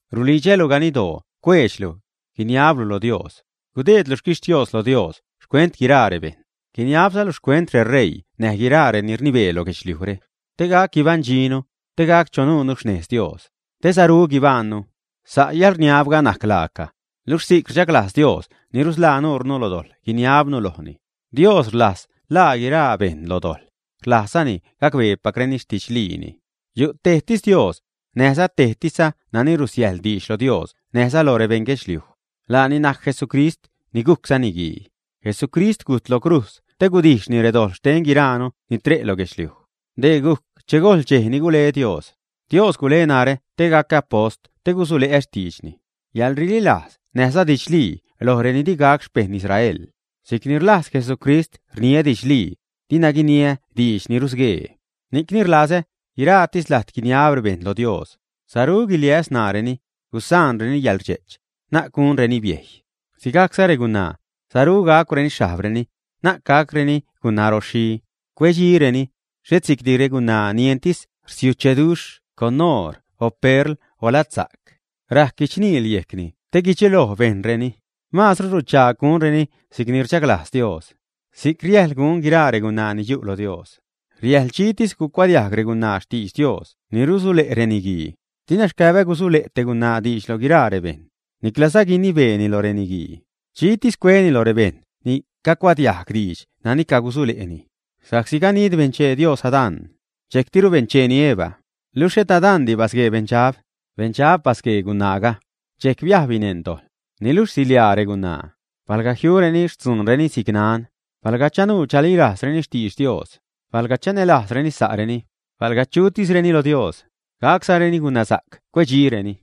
Rulidxälu ganiddoo cueedxlu, guiniablu lo Dios, gudeedlu xquixtios lo Dios xcuent guiraa rebejṉ. Guiniabzalu xcuent reṟeii näj guiraa reni rnibee lo guedxliujre, te gac guibaṉdxinu, te gac chanuunu xnez Dios, te saru guibajṉnu. Sa' yäḻrniabga najc laaca, luxh si'c rdxaglajz Dios ni rusḻaa nurnu lo dojḻ guiniabnu lojni. Dios rlajz ḻaa guiraa bejṉ lo dojḻ, rlajzzani gacbeepacreni xtidxliini. Yu' tejtis Dios, näjza tejtisza nani rusiäjḻ diidx lo Dios näjza loj rebeṉ guedxliuj. Laani najc Jesucrist ni gujcza niguii. Jesucrist gujt lo crujz te gudijxni redojḻ xten guiraanu ni tre' lo guedxliuj. Dee gujc che gojl dxej ni gule Dios. Dios gule narä te gacä apost te gusule'ä xtiidxni, yäḻrililajz näjza didxlii lo reni di gac xpejṉ Israel. Si'c ni rlajz Jesucrist rniä didxlii, dina guiniä diidx ni rusguee. Ni'cni rlazä guiraatis lajt guiniab rebejṉ lo Dios, saru guiliäs ṉaareni, gusaanreni yäḻrdxe'ch, na'c gunreni biejy. Si'cza regunaa, saru gacwreni xhajbreni, na'c gacreni gunaroxhi, cuedxireni. Xhet si'cdi regunaa ni entis rsiucheduxh con oor o perl o ladsajc, rajc guichniil yejcni te guidxeloj bejṉreni. Masru ruchaag gunreni si'cni rchalglajz Dios, si'c riäjḻ gun guiraa regunaa ni yu' lo Dios. Riäjḻ dxitis gucuadiajg regunaa xtidx Dios ni rusule' reniguii. Dina xcäbä gusule' te gunaa diidx lo guiraa rebejṉ, niclaza guinibeeni lo reniguii, dxitis cueni lo rebejṉ ni cagucuadiajg diidx nani cagusule'ni. Sa'csi ganid benchee Dios Adán, dxejctiru bencheeni Eva. Luxh et Adandi basguee beṉdxab, beṉdxab basguee gunaaga, dxejc biajbni neṉ dojḻ. Niluxh siḻiaa regunaa, palga jiureni xtzuunreni si'c nan, palga chanuu chalilajzreni xtidx Dios, palga chanälajzreni sa'reni, palga chutisreni lo Dios, gaczareni gunasa'c cuedxireni.